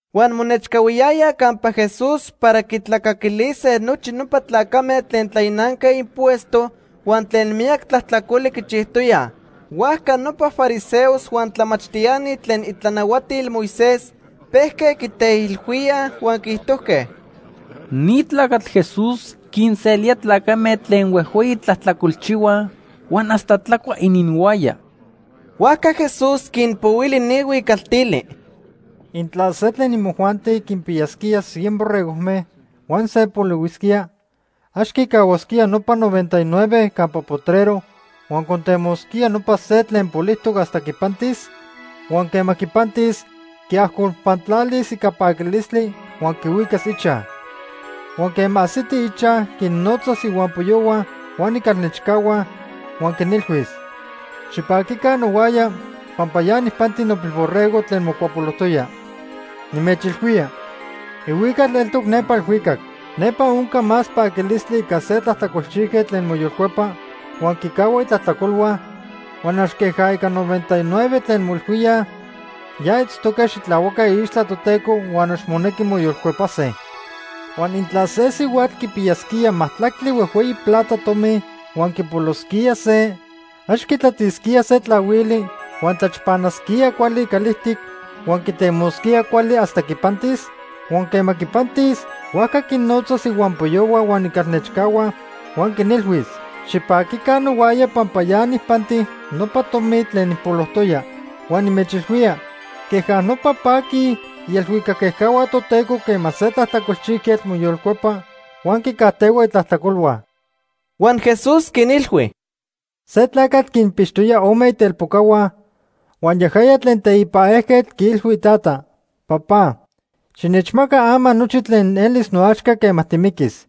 Huan monechcahuiyayaj campa Jesús para quitlacaquilise nochi nopa tlacame tlen tlainanque impuesto huan tlen miyac tlajtlacoli quichijtoyaj. Huajca nopa fariseos huan tlamachtiani tlen itlanahuatil Moisés pejque quiteilhuíaj huan quiijtojque: ―Ni tlacatl Jesús quinselía tlacame tlen huejhueyi tlajtlacolchihuaj huan hasta tlacua ininhuaya. Huajca Jesús quinpohuili ni huicaltili: “Intla se tlen imojuanti quinpiyasquía cien borregojme huan se polihuisquía, ¿ax quicahuasquía nopa noventa y nueve campa potrero huan contemosquía nopa se tlen polijtoc hasta quipantis? Huan quema quipantis, quiajcolpantlalis ica paquilistli huan quihuicas ichaj. Huan quema ajsiti ichaj, quinnotzas ihuampoyohua huan icalnechcahua huan quinilhuis: ‘Xipaquica nohuaya pampa ya nijpanti nopilborrego tlen mocuapolojtoya.’ Nimechilhuía, ihuical eltoc nepa elhuicac. Nepa onca más paquilistli ica se tlajtlacolchijquetl tlen moyolcuepa huan quicahua itlajtlacolhua, huan ax queja ica noventa y nueve tlen moilhuíaj ya itztoque xitlahuaque iixtla Toteco huan ax monequi moyolcuepase. “Huan intla se sihuatl quipiyasquía majtlactli huejhueyi plata tomi huan quipolosquía se, ¿ax quitlatisquía se tlahuili, huan tlachpanasquía cuali calijtic huan quitemosquía cuali hasta quipantis? Huan quema quipantis, huajca quinnotzas ihuampoyohua huan icalnechcahua huan quinilhuis: ‘Xipaquica nohuaya pampa ya nijpanti nopa tomi tlen nijpolojtoya.’ Huan nimechilhuía, queja nopa paquij ielhuicac ejcahua Toteco quema se tlajtlacolchijquetl moyolcuepa huan quicajtehua itlajtlacolhua.” Huan Jesús quinilhui: “Se tlacatl quinpixtoya ome itelpocahua, huan yajaya tlen teipa ejquetl quiilhui itata: ‘Papá, xinechmaca ama nochi tlen elis noaxca quema timiquis.’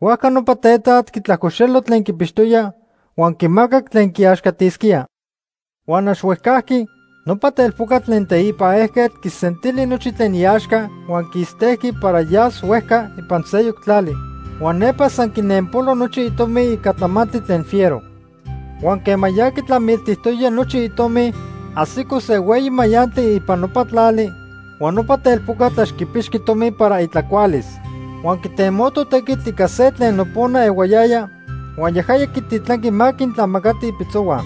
Huajca nopa tetat quitlajcoxelo tlen quipixtoya, huan quimacac tlen quiaxcatisquía. Huan ax huejcajqui nopa telpocatl tlen teipa ejquetl quisentili nochi tlen iaxca huan quistejqui para yas huejca ipan seyoc tlali. Huan nepa san quinenpolo nochi itomi ica tlamantli tlen fiero. Huan quema ya quitlamiltijtoya nochi itomi, ajsico se hueyi mayantli ipan nopa tlali, huan nopa telpocatl ax quipixqui tomi para itlacualis. Huan quitemoto tequitl ica se tlen nopona ehuayaya, huan yajaya quititlanqui ma quintlamacati ipitzohua.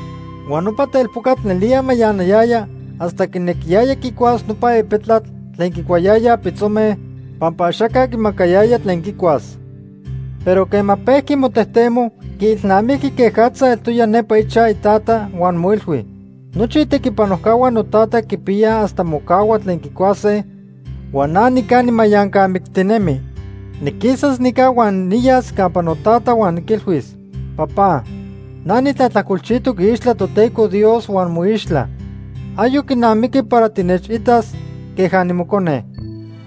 Huan nopa telpocatl nelía mayanayaya hasta quinequiyaya quicuas nopa epetlatl tlen quicuayayaj pitzome, pampa axaca quimacayaya tlen quicuas. Pero quema pejqui motejtemo, quiilnamijqui quejatza eltoya nepa ichaj itata huan moilhui: ‘Nochi itequipanojcahua notata quipiyaj hasta mocahua tlen quicuase, huan na nica nimayancamictinemi. Niquisas nica huan niyas campa notata huan niquilhuis: Papá, na nitlajtlacolchijtoc iixtla Toteco Dios huan moixtla. Ayoc quinamiqui para tinechitas queja nimocone.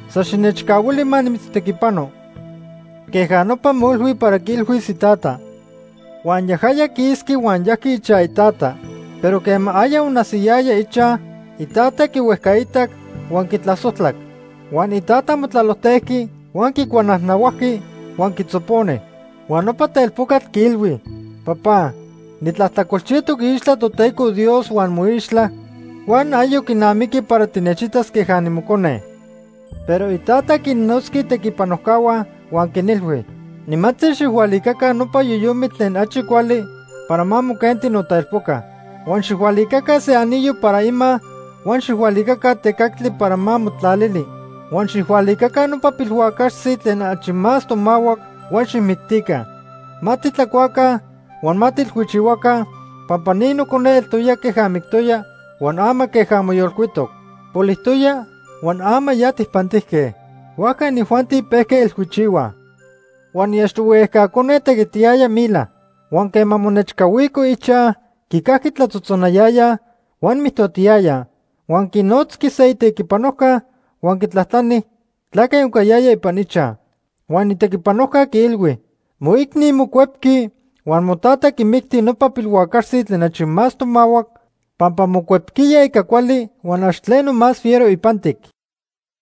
San xinechcahuili ma nimitztequipano.’ Queja nopa moilhui para quiilhuis itata. “Huan yajaya quisqui huan yajqui ichaj itata. Pero quema aya onajsiyaya ichaj, itata quihuejcaitac huan quitlasojtlac. Huan itata motlalojtejqui, huan quicuanajnahuajqui huan quitzoponi. Huan nopa telpocatl quiilhui: ‘Papá, nitlajtlacolchijtoc iixtla Toteco Dios huan moixtla, huan ayoc quinamiqui para tinechitas queja nimocone.’ “Pero itata quinnotzqui itequipanojcahua huan quinilhui: ‘Nimantzi, xijhualicaca nopa yoyomitl tlen achi cuali para ma moquenti notelpoca. Huan xijhualicaca se anillo para ima huan xijhualicaca tecactli para ma motlalili. Huan xijhualicaca nopa pilhuacaxtzi tlen achi más tomahuac huan xijmictica. Ma titlacuaca huan ma tiilhuichihuaca, pampa ni nocone eltoya queja mictoya, huan ama queja moyolcuitoc. Polijtoya huan ama ya tijpantijque.’ “Huajca inijuanti pejque ilhuichihuaj. “Huan iachtohui ejca cone tequitiyaya mila. Huan quema monechcahuico ichaj, quicajqui tlatzotzonayayaj huan mijtotiyayaj. Huan quinotzqui se itequipanojca huan quitlajtlani tlaque oncayaya ipan ichaj. Huan itequipanojca quiilhui: ‘Moicni mocuepqui huan motata quimicti nopa pilhuacaxtzi tlen achi más tomahuac pampa mocuepquiya ica cuali huan ax tleno más fiero ipantic.’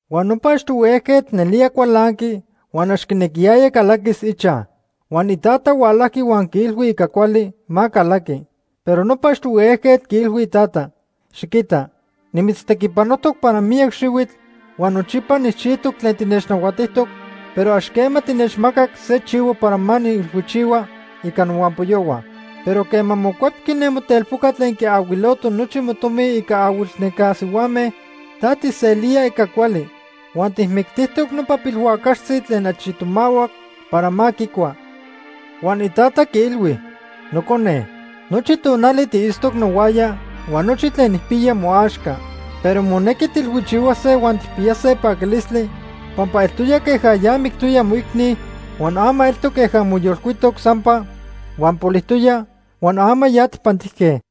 “Huan nopa achtohui ejquetl nelía cualanqui huan ax quinequiyaya calaquis ichaj. Huan itata hualajqui huan quiilhui ica cuali ma calaqui. Pero nopa achtohui ejquetl quiilhui itata: ‘Xiquita, nimitztequipanojtoc para miyac xihuitl huan nochipa nijchijtoc tlen tinechnahuatijtoc, pero ax quema tinechmacac se chivo para ma niilhuichihua ica nohuampoyohua. Pero quema mocuepqui ne motelpoca tlen quiahuiloto nochi motomi ica ahuilnenca sihuame, ta tijselía ica cuali. Huan tijmictijtoc nopa pilhuacaxtzi tlen achi tomahuac para ma quicua.’ “Huan itata quiilhui: ‘Nocone, nochi tonali tiitztoc nohuaya huan nochi tlen nijpiya moaxca. Pero monequi tiilhuichihuase huan tijpiyase paquilistli pampa eltoya queja ya mictoya moicni huan ama eltoc queja moyolcuitoc sampa, huan polijtoya huan ama ya tijpantijque.’”